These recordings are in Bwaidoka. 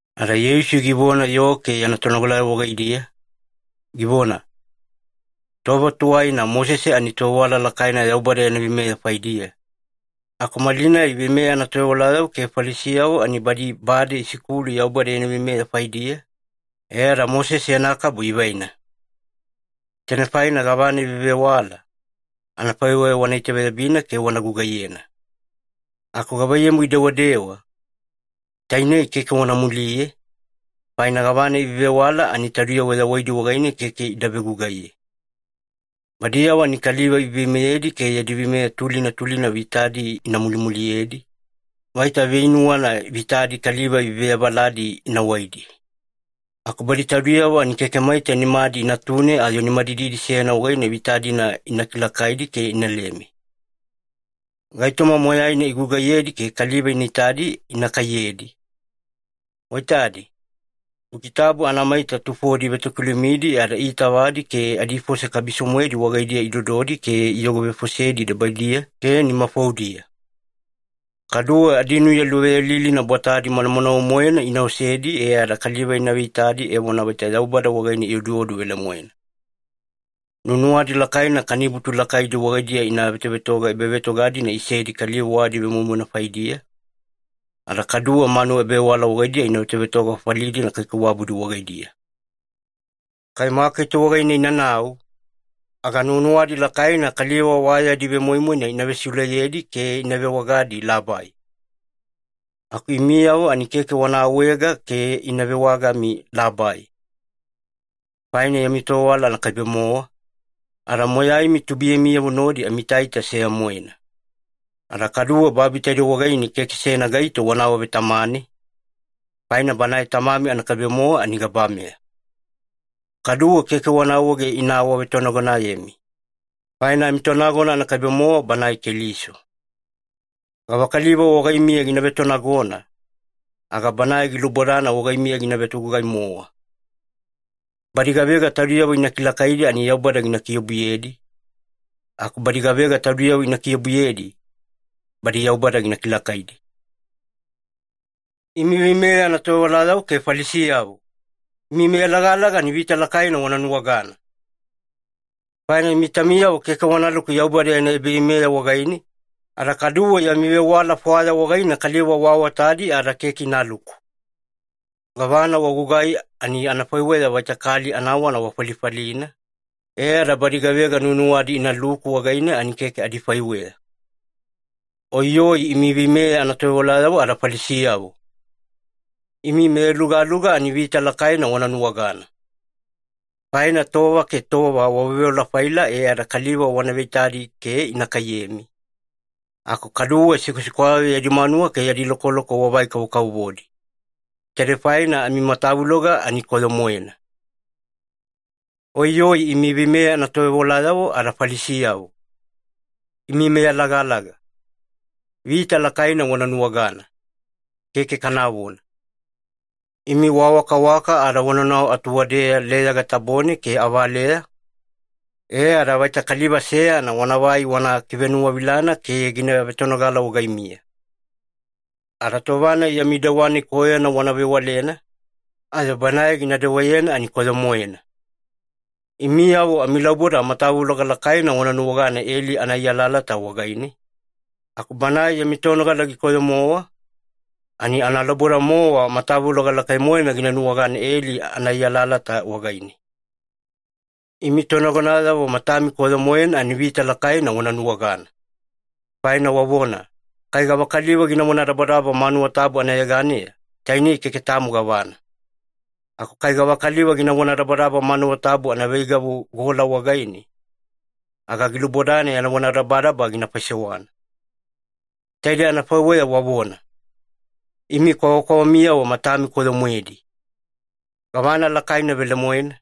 Ada Yeisu givona yoo ke yana tonogalayavo wagaidiya, givona, “Tova tuwaina Mosese ani tovewala lakaina Yaubada yana veimeya faidiya, aku malinai veimeya anatovewalayavo ke Falisiyavo ani badi bade isikulu Yaubada yana veimeya faidiya, e ada Mosese yana kabu ivaina. Tainei faina gavana ivevewala, anafaiweya wana itaveyabina ke wana gugaiyena. Aku gavaiyamu idewadewa, tainei keke wana muliye, faina gavana ivevewala ani taudiyavo yawaidi wagaine keke ida vegugaiye. Badiyavo ani kaliva iveiveimeyedi ke yadi veimeya tulina tulina vitadi ina mulimuliyedi, vaita veinuwana vitadi kaliva iveavaladi ina waidi. Aku badi taudiyavo ani keke maita nimadi inatune ayo nimadididi seyana wagaine vita-dina ina kilakaidi ke inaleme. “Gaitoma moyaina igugaiyedi ke kaliva ina itadi ina kaiyedi. Waitadi, Buki Tabu anamaita tufodi ivetokilumidi ada iitavadi ke adifose kabiso-moedi wagaidiya idododi ke iyogovefosedi debaidiya ke nimafoudiya. Kaduwe adinuya luveyalilina bwatadi manamanawe-moena ina osedi e ada kaliva ina veitadi evona vaita Yaubada wagaine ioduodu velemoena. Nuwanuwadi lakaina kanibutu lakaidi wagaidiya ina vetovetoga ebavetoga-dina isedi kaliva wa adivemoimoina faidiya, ada kaduwe manuwa ebavewala wagaidiya ina vetovetoga fafali-dina kaikaiwabudi wagaidiya. Kai maketi wagaine inanau, aga nuwanuwadi lakaina kaliva wa yadi vemoimoina ina vesiuleyedi ke ina vewagadi ‘labai’. Aku imiyavo ani keke wana awaega ke ina vewagami ‘labai’. Faina yami tovewala anakaibe-mowa, ada moyaimi tubuiyamiyavo nodi amiitaita seya-moena. Ada kaduwe babi taidei wagaine keke seyana gaito wana awavetamane, faina Banae Tamami anakaibe-mowa ani gabameya. Kaduwe keke wana awaege ina awavetonagonayemi, faina amiTonagona anakaibe-mowa Banae Keliso. Gavakaliva wagaimiya gina vetonagona, aga banae gilubodana wagaimiya gina vetogugai-mowa. Badi gavega taudiyavo ina kilakaidi ani Yaubada gina kiobuyedi, aku badi gavega taudiyavo ina kiobuyedi, badi Yaubada gina kilakaidi.” “Imi veimeya anatovewalayavo ke Falisiyavo, imi meyalagalaga ani vita lakaina wana nuwagana! Faina imi taumiyavo keke wanaluku Yaubada yana ebaveimeya wagaine, ada kaduwe yami vewala fwaya wagaine kaliva waawatadi ada keke inaluku. Gavana wagugai ani anafaiweya vaita kali anawana wafalifalina, e ada badi gavega nuwanuwadi inaluku wagaine ani keke adifaiweya. “Oiyoi imi veimeya anatovewalayavo ada Falisiyavo! Imi meyalugaluga ani vita lakaina wana nuwagana! Faina tova ke tova waveoveola-faila e ada kaliva wana veitadi ke ina kaiyemi, aku kaduwe sikwasikwayavo yadi manuwa ke yadi lokoloko wavai-kavovodi. Taidei faina amimatavuloga ani koyo-moena. “Oiyoi imi veimeya anatovewalayavo ada Falisiyavo, imi meyalagalaga! Vita lakaina wana nuwagana! Keke kanavona! Imi waawakawaka ada wanaunau atuwadeya leyaga tabone ke avaleya, e ada vaita kaliva seyana wanavai wana kivenuwavilana ke gina vetonogala wagaimiya. Ada tova-nai yami dewa-nai koyona wana vewalena, ayo banae gina dewayena ani koyo-moena. Imiyavo amilauboda matavuloga lakaina wana nuwagana eli anaai alalata wagaine, aku banae yami tonogala gikoyo-mowa, ani analauboda-mowa matavuloga lakai-moena gina nuwagana eli anaai alalata wagaine. “Imi tonagonayavo matami koyo-moena ani vita lakaina wana nuwagana! Faina wavona, ‘Kai gavakaliva gina vonadabadaba manuwa tabu anayeganeya, tainei keke tamo gavana. Aku kai gavakaliva gina vonadabadaba manuwa tabu anaveigavu gola wagaine, aga gilubodana yana vonadabadaba gina faisewana.’ Taidei anafaiweya wavona. Imi kwavakwavamiyavo matami koyo-moedi! Gavana lakaina velemoena,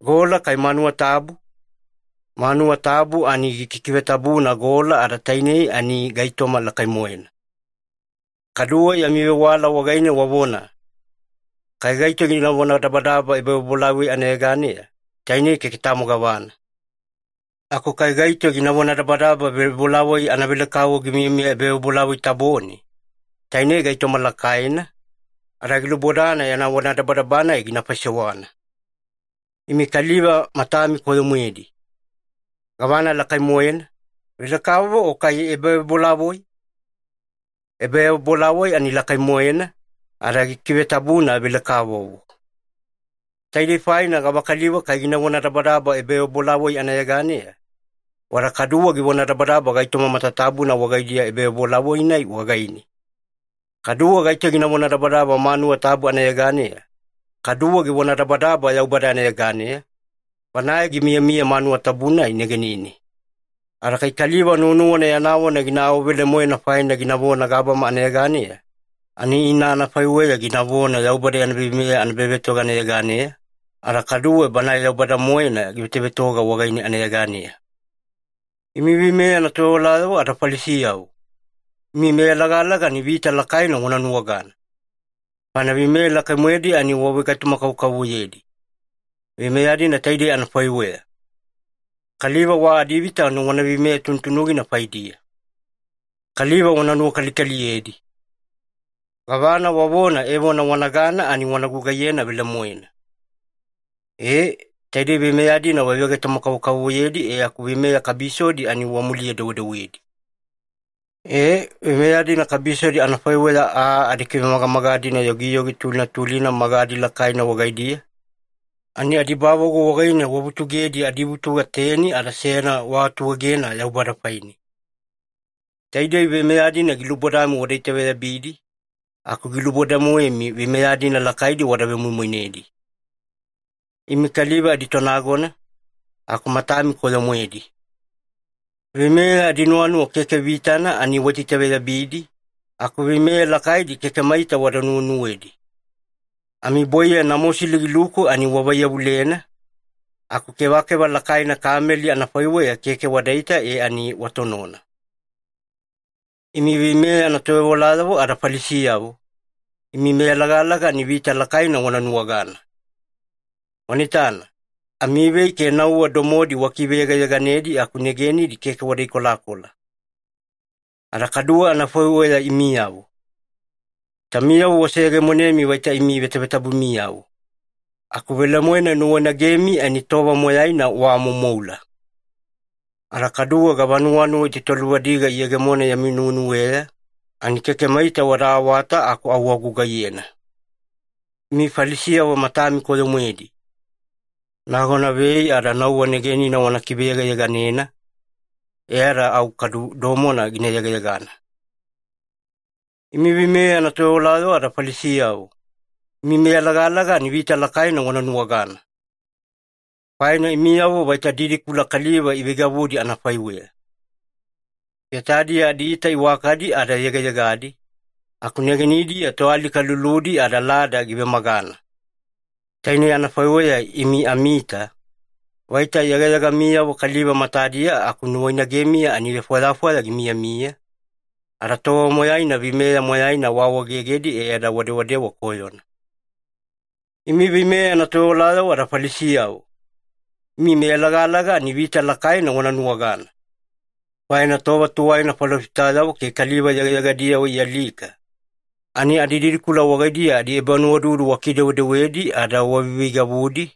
gola kai manuwa tabu? Manuwa tabu ani gikikivetabuna gola ada tainei ani gaitoma lakai-moena. Kaduwe yami vewala wagaine wavona, ‘Kai gaito gina vonadabadaba ebavebolavoi anayeganeya, tainei keke tamo gavana. Aku kai gaito gina vonadabadaba vebolavoi anavelekavovo gimiyamiya ebavebolavoi tabone, tainei gaitoma lakaina, ada gilubodana yana vonadabadaba-nai gina faisewana.’ Imi kaliva matami koyo-moedi! Gavana lakai-moena, velekavovo o kai ebavebolavoi? Ebavebolavoi ani lakai-moena, ada gikikivetabuna velekavovo. Taidei faina gavakaliva kai gina vonadabadaba ebavebolavoi anayeganeya, wada kaduwe givonadabadaba gaitoma matatabuna wagaidiya ebavebolavoi-nai wagaine. Kaduwe gaito gina vonadabadaba manuwa tabu anayeganeya, kaduwe givonadabadaba Yaubada anayeganeya, Banae gimiyamiya manuwa tabu-nai negenine. Ada kai kaliva nuwanuwana yana vona gina awavelemoena faina ginavona gabama anayeganeya, ani ina anafaiweya ginavona Yaubada yana veimeya anaebavetoga anayeganeya, ada kaduwe Banae Yaubada-moena givetovetoga wagaine anayeganeya. “Imi veimeya anatovewalayavo ada Falisiyavo, imi meyalagalaga ani vita lakaina wana nuwagana! Faina veimeya lakai-moedi ani wavegaitoma-kavokavovoyedi. Veimeya-dina taidei anafaiweya. Kaliva wa adivita ani wana veimeya tunutunugina faidiya. Kaliva wana nuwakalikaliyedi. Gavana wavona evona wanagana ani wana gugaiyena velemoena. E, taidei veimeya-dina wavegaitoma-kavokavovoyedi e aku veimeya kabisodi ani wamuliye-dewedewedi. E, veimeya-dina kabisodi anafaiweya aa adikivemagamaga-dina yogiyogi tulina tulina magadi lakaina wagaidiya, ani adibavagu wagaine wavutugedi adivutuga teni ada seyana waatuegena Yaubada faine. Taidei veimeya-dina gilubodami wada itaveyabidi, aku giluboda-moemi veimeya-dina lakaidi wada vemoimoinedi. Imi kaliva aditonagona, aku matami koyo-moedi. Veimeya adinuwanuwa keke vitana ani waitaitaveyabidi, aku veimeya lakaidi keke maita wada nuwenuwedi. Amibwaiya namosili giluku ani wavaiyavulena, aku kevakeva lakaina kameli anafaiweya keke wadaita e ani watonona. “Imi veimeya anatovewalayavo ada Falisiyavo, imi meyalagalaga ani vita lakaina wana nuwagana! Wana itana, amivei ke nauwa domodi wakiveyegayeganedi aku negenidi keke wada ikolakola. Ada kadu anafaiweya imiyavo. Taumiyavo waseyegemonemi vaita imi vetavetabumiyavo, aku velemoena nuwainagenimi ani tova moyaina waamoumoula. Ada kaduwe gavanuwanuwa itaitaluvadiga giyegemona yami nuwenuweya, ani keke maita wada awata aku au wagugaiyena. Imi Falisiyavo matami koyo-moedi! Nagona vei ada nauwa negenina wana kiveyegayeganena, e ada au kadu domona gina yegayegana. “Imi veimeya anatovewalayavo ada Falisiyavo, imi meyalagalaga ani vita lakaina wana nuwagana! Faina imiyavo vaita didikula kaliva iveigavudi anafaiweya. Getadiya adiita iwakadi ada yegayegadi, aku negenidiya toalika luludi ada lada givemagana. Tainei anafaiweya imi amiita, vaita yegayegamiyavo kaliva matadiya aku nuwainagemiya ani vefwayafwaya gimiyamiya, ada tova moyaina veimeya moyaina waawaegegedi e ada wadewadewa koyona. “Imi veimeya anatovewalayavo ada Falisiyavo, imi meyalagalaga ani vita lakaina wana nuwagana! Faina tova tuwaina falofitayavo ke kaliva yegayegadiyavo ialika, ani adididikula wagaidiya adiebanuwaududu wakidewedewedi ada waveiveigavudi,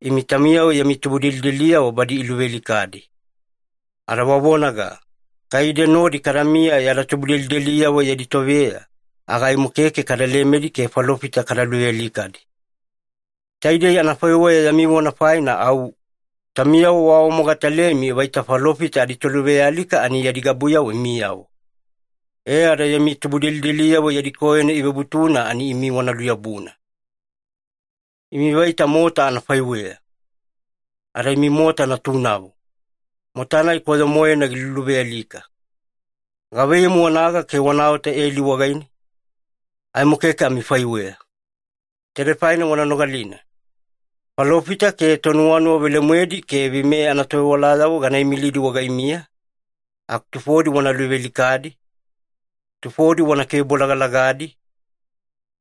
imi taumiyavo yami tubudelideliyavo badi iluvealikadi. Ada wavonaga, ‘Kai ide nodi kadamiya yada tubudelideliyavo yadi toveya, aga aimo keke kada lemedi ke falofita kada luvealikadi.’ Taidei anafaiweya yami vona faina au, taumiyavo waawamogatalemi vaita falofita aditoluvealika ani yadi gabuyavo imiyavo. E ada yami tubudelideliyavo yadi koyona ivebutuna ani imi wana luyabuna! “Imi vaita mota anafaiweya! Ada imi mota natunavo, mota-nai koyo-moena giluluvealika. Gavaiyamu wanaga ke wanaota eli wagaine? Aimo keke amifaiweya. Taidei faina wana nogalina. Falofita ke tonuwanuwa velemoedi ke veimeya anatovewalayavo gana imilidi wagaimiya, aku tufodi wana luvealikadi, tufodi wana kivebolagalagadi,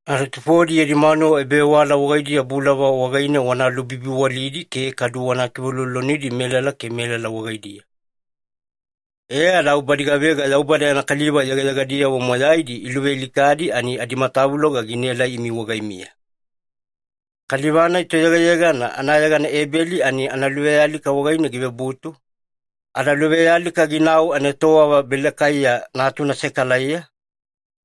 ada tufodi yami manuwa ebavewala wagaidiya bulava wagaine wana lubibiwalidi ke kadu wana kiveuloulolonidi melala ke melala wagaidiya. E ada au badi gavega Yaubada yana kaliva yegayegadiyavo moyaidi iluvealikadi ani adimatavuloga ginaelai imi wagaimiya. Kaliva-nai toyegayegana anayegana Ebeli ani analuvealika wagaine givebutu, ada luvealika ginau anaetowava Belekaiya natuna Sekalaiya,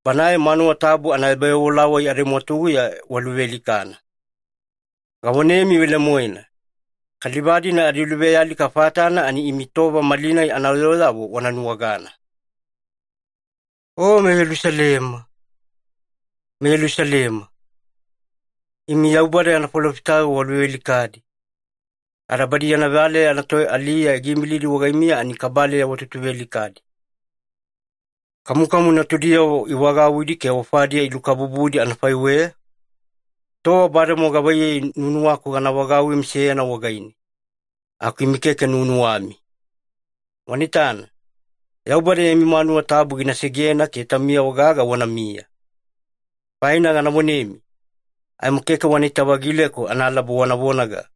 banae manuwa tabu ada ebavebolavoi adimwatuguya waluvealikana. Gavonemi velemoena, kaliva-dina adiluvealika fatana ani imi tova malinai anayooyavo wana nuwagana. “O meYelusalema, meYelusalema, imi Yaubada yana falofitayavo waluvealikadi, ada badi yana valeya anatoaliya giimilidi wagaimiya ani kabaleya watutuvealikadi. Kamukamu natudiyavo ivagauwidi ke ofadiya ilukabubudi anafaiweya, tova bademowa gavaiyei nuwanuwaku gana vagauwimi seyana wagaine. Aku imi keke nuwanuwami. Wana itana, Yaubada yami manuwa tabu gina segena ke taumiyavo gaga wanamiya. Faina gana vonemi, aimo keke wanaita-vagileku analaba wana vonaga,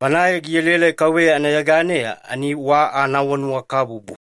‘Banae gielaelai KAUVEYA anayeganeya ani wa anaawanuwakabubu.’”